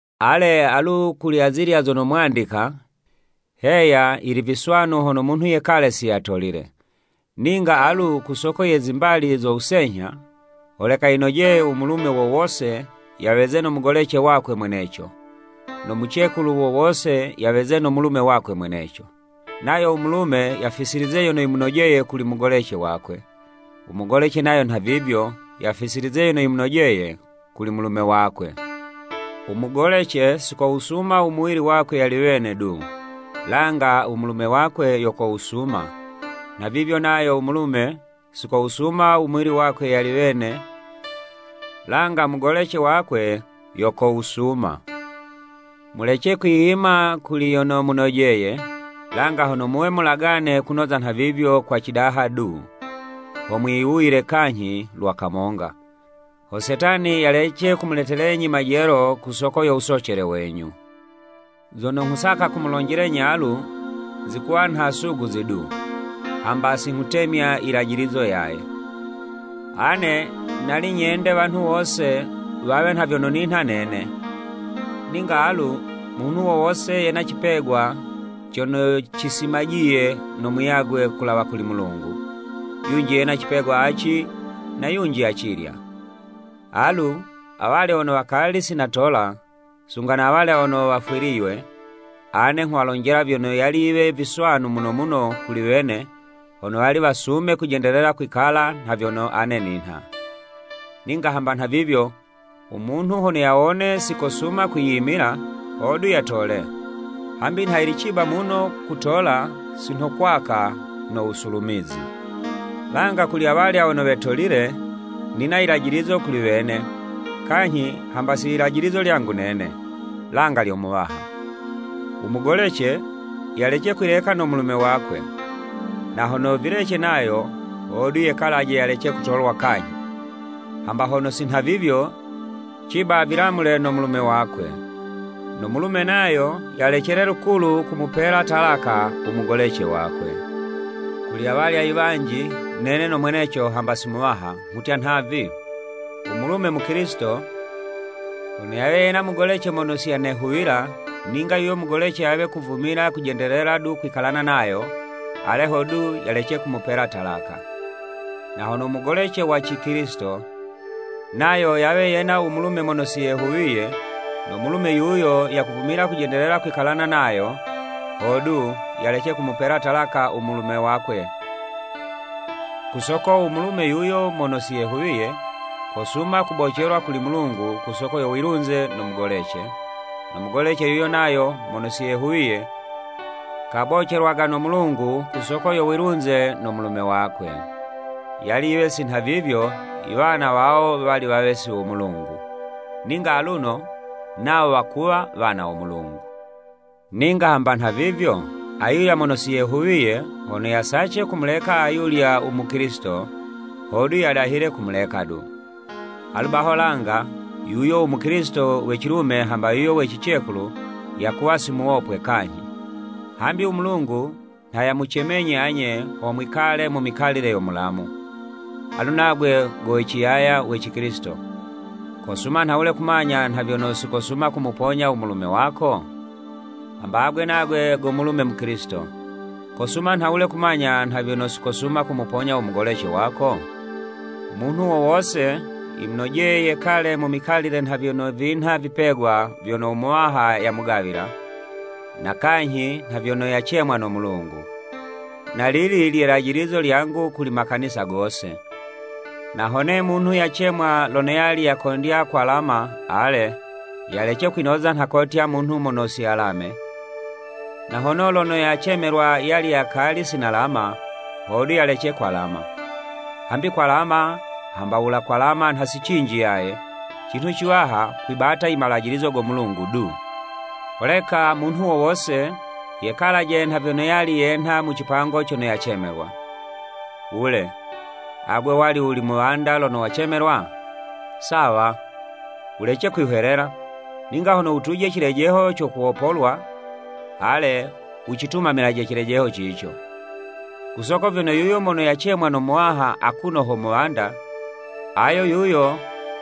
Ale, alu kuli azilya zono mwandika, Heya yili viswanu hono munhu yekale si yatolile, ninga alu ku soko ye zimbali zo wusenyha, holeka yinojeye u mulume wo wose, yaweze no mugolece wakwe mweneco, no mucekulu wo wose yaweze no mulume wakwe mweneco. Nayo u mulume yafisilize yono yimunojeye kuli mugolece wakwe, u mugolece nayo nhavivyo, yafisilize yono yimunojeye kuli mulume wakwe. U mugolece si kowusuma u muwili wakwe yali wene du, langa u mulume wakwe yo kowusuma, nhavivyo nayo u mulume, si kowusuma u muwili wakwe yali wene, langa mugolece wakwe yo kowusuma. Mulece kwiyima kuli yono munojeye, langa hono muwe mulagane kunoza nhavivyo kwa cidaha du, ho mwiwuyile kanyhi lwa kamonga, ho Setani yalece kumuletelenyi majelo ku soko yo wusocele wenyu. Zono nghusaka kumulonjelenyi alu, zikuwa nha suguzi du, hamba si nghutemya yilajilizo yaye. Ane nali nyende wanhu wose wawe nha vyono ninha nene, ninga alu munhu wo wose yena cipegwa cono cisimajiye no muyagwe kulawa kuli Mulungu, yunji yena cipegwa aci, na yunji acilya. Alu, awalya wono wakali si natola, sunga na awalya wono wafwiliywe, ane nghuwalonjela vyono yali yiwe viswanu muno muno kuli wene, hono wali wasume kujendelela kwikala nha vyono ane ninha. Ninga hamba nha vivyo, u munhu hono yawone si yakusuma kwiyimila, hodu yatole, hambi nha yili ciba muno kutola, si nho kwaka no wusulumizi. Langa kuli awalya wono wetolile, nina yilajilizo kuli wene, kanyhi hamba si yilajilizo lyangu nene, langa lyo Muwaha. U mugolece yalece kwileka no mulume wakwe, na hono vilece nayo, hodu yekalaje yalece kutolwa kanyhi, hamba hono si nha vivyo, ciba vilamule no mulume wakwe. No mulume nayo yalecele lukulu kumupela talaka u mugolece wakwe. Kuli awalya i wanji, (nene no mweneco hamba si Muwaha) nghutya nhavi, u mulume Mukilisito, hono yawe yena mugolece mono siyanehuwila, ninga yuyo mugolece yawe kuvumila kujendelela du kwikalana nayo, ale hodu yalece kumupela talaka. Na hono u mugolece wa cikilisito, nayo yawe yena u mulume mono si yehuwiye, no mulume yuyo yakuvumila kujendelela kwikalana nayo, hodu, yalece kumupela talaka u mulume wakwe. Ku soko u mulume yuyo mono si yehuwiye, kosuma kubocelwa kuli Mulungu ku soko yo wilunze no mugolece, no mugolece yuyo nayo mono si yehuwiye kabocelwaga no Mulungu ku soko yo wilunze no mulume wakwe. Yali yiwe si nhavivyo, i wana wawo wali wawe si wo Mulungu, ninga aluno nawo wakuwa wana wo Mulungu. Ninga hamba nhavivyo, ayulya mono si yehuwiye, hono yasace kumuleka ayulya u Mukilisito, hodu yadahile kumuleka du. Alu baho langa, yuyo u Mukilisito we cilume hamba yuyo we cicekulu yakuwa si muwopwe kanyhi. Hambi u Mulungu nha yamucemenyi anye, ho mwikale mu mikalile yo mulamu. Alu nagwe go we ciyaya we Cikilisito, kosuma nhawule kumanya nha vyono si kosuma kumuponya u mulume wako? Hamba agwe nagwe go mulume Mukilisito, kosuma nhawule kumanya nha vyono si kosuma kumuponya u mugolece wako? Munhu wo wose yimunojeye yekale mu mikalile nha vyono vinha vipegwa vyono u Muwaha yamugawila, na kanyhi nha vyono yacemwa no Mulungu. Na lili lye'lajilizo lyangu kuli makanisa gose. Na hone munhu yacemwa lono yali yakondya kwalama ale, yalece kwinoza nha kotya munhu mono si yalame, na hono lono yacemelwa yali yakali si nalama, hodu yalece kwalama. Hambi kwalama hamba wula kwalama nha si cinji yaye, cinhu ciwaha, kwibata i malajilizo go Mulungu du. Holeka munhu wo wose, yekalaje nha vyono yali yenha mu cipango cono yacemelwa. Wule, agwe wali wuli muwanda lono wacemelwa? Sawa! Wulece kwihwelela, ninga hono wutuje cilejeho co kuwopolwa, ale wucitumamilaje cilejeho cico. Ku soko vyono yuyo mono yacemwa no Muwaha akuno ho muwanda, ayo yuyo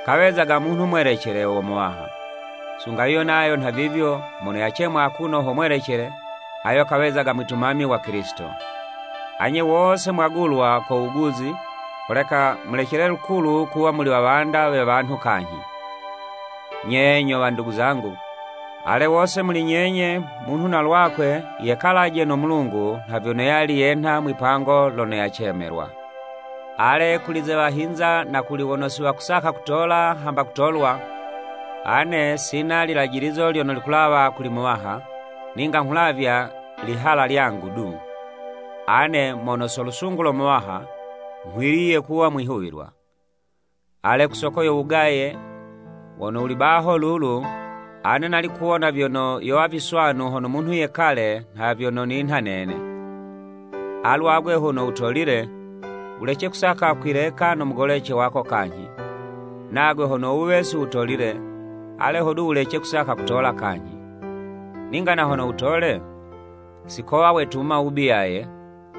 kawezaga munhu mwelecele, wo Muwaha. Sunga yuyo nayo nha vivyo, mono yacemwa akuno ho mwelecele ayo kawezaga mwitumami wa Kilisito. Anye wose mwagulwa ko wuguzi, holeka mulecele lukulu kuwa muli wawanda we wanhu kanyhi. Nye nyo wandugu zangu, ale wose muli nyenye, munhu na lwakwe yekalaje no Mulungu nha vyono yali yenha mwi'pango lono yacemelwa. Ale, kuli ze wahinza na kuli wono si wakusaka kutola hamba kutolwa, ane sina lilajilizo lyono likulawa kuli Muwaha, ninga nghulavya lihala lyangu du, ane mono so lusungu lo Muwaha, nghwiliye kuwa mwihuwilwa. Ale, ku soko yo wugaye wono wuli baho lulu, ane nali kuwona vyono, yowa viswanu hono munhu yekale nha vyono ninha nene. Alu agwe hono wutolile, wulece kusaka kwileka no mugolece wako kanyhi. Nagwe hono wuwe si wutolile, ale hodu wulece kusaka kutola kanyhi. Ninga na hono wutole, si kowa wetuma wubi yaye,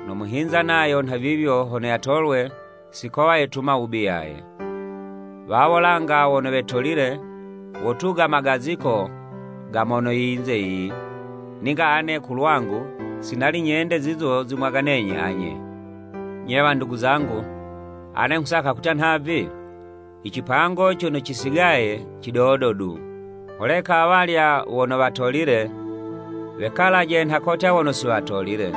no muhinza nayo nhavivyo hono yatolwe, si kowa yetuma wubi yaye. Wawo langa wono wetolile, wotuga magaziko ga mono yinze yiyi, ninga ane ku lwangu, si nali nyende zizo zimwaganenyi anye. Nye wandugu zangu, ane nghusaka kutya nhavi, i cipango cono cisigaye cidodo du. Holeka awalya wono watolile, wekalaje nha kotya wono si watolile,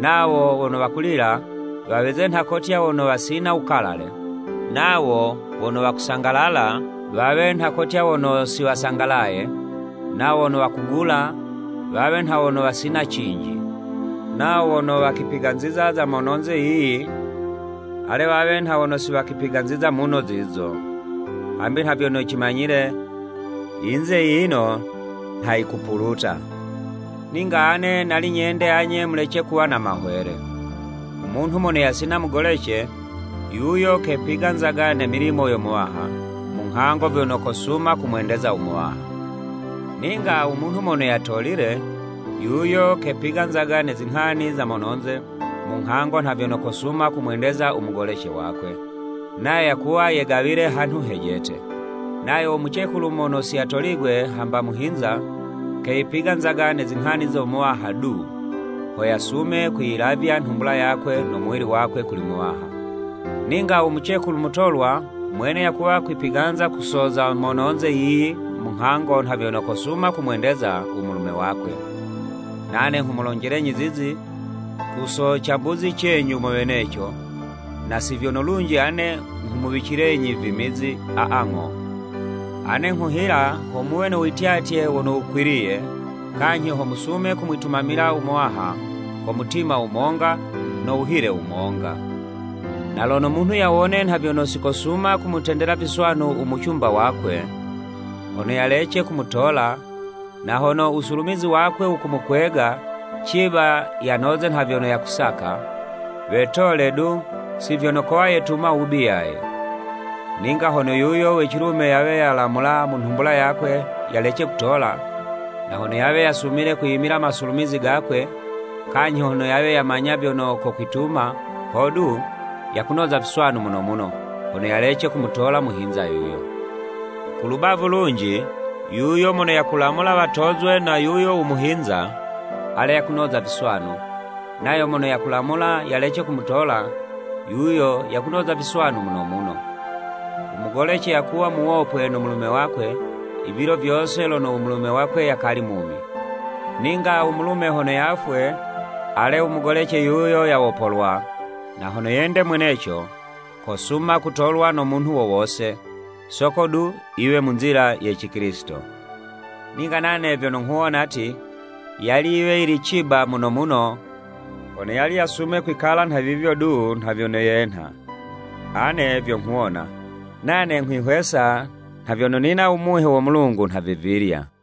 nawo wono wakulila, waweze nha kotya wono wasina wukalale, nawo wono wakusangalala, wawe nha kotya wono si wasangalaye, nawo wono wakugula, wawe nha wono wasina cinji, nawo wono wakipiganziza za mono'nze yiyi, ale wawe nha wono si wakwipiganziza muno zizo. Hambi nha vyono cimanyile, yinze yiyino nha yikupuluta. Ninga ane nali nyende anye mulece kuwa na mahwele. U munhu mono yasina mugolece, yuyo kepiganzaga ne milimo yo Muwaha, mu nghango vyono kosuma kumwendeza u Muwaha. Ninga u munhu mono yatolile, yuyo kepiganzaga ne zinghani za mononze, mu nghango nha vyono kosuma kumwendeza u mugolece wakwe, nayo yakuwa yegawile hanhu hejete. Nayo u mucekulu mono siyatoligwe hamba muhinza, keyipiganzaga ne zinghani zo Muwaha du, ho yasume kwiyilavya nhumbula yakwe no muwili wakwe kuli Muwaha. Ninga u mucekulu mutolwa mwene yakuwa kwipiganza ku so za mononze yiyi munghango nha vyono kosuma kumwendeza u mulume wakwe. Nane nghumulonjelenyi zizi ku so cambuzi cenyu mo weneco, na si vyono lunji ane nghumuwicilenyi vimizi, aa ng'o. Ane nghuhila ho muwe no wityatye wono wukwiliye, kanyhi ho musume kumwitumamila u Muwaha ko mutima wumonga no wuhile wumonga. Na lono munhu yawone nha vyono si kosuma kumutendela viswanu u mucumba wakwe, hono yalece kumutola, na hono u wusulumizi wakwe wakumukwega, ciba yanoze nha vyono yakusaka, wetole du si vyono kowa yetuma wubi yaye. Ninga hono yuyo we cilume yawe yalamula mu nhumbula yakwe yalece kutola, na hono yawe yasumile kwiyimila masulumizi gakwe, kanyhi hono yawe yamanya vyono kokwituma, hodu, yakunoza viswanu muno muno, hono yalece kumutola muhinza yuyo. Ku lubavu lunji, yuyo mono yakulamula watozwe na yuyo u muhinza, ale, yakunoza viswanu, nayo mono yakulamula, yalece kumutola, yuyo yakunoza viswanu muno muno. U mugolece yakuwa muwopwe no mulume wakwe i vilo vyose lono u mulume wakwe yakali mumi. Ninga u mulume lono yafwe, ale u mugolece yuyo yawopolwa, na hono yende mweneco, kosuma kutolwa no munhu wo wose, soko du yiwe mu nzila ye Cikilisito. Ninga nane vyono nghuwona ti, yali yiwe yili ciba muno muno hono yali yasume kwikala nha vivyo du nha vyono yenha. Ane vyo nghuwona, nane nghwihwesa nha vyono nina u Muhe wo Mulungu nhavivilya.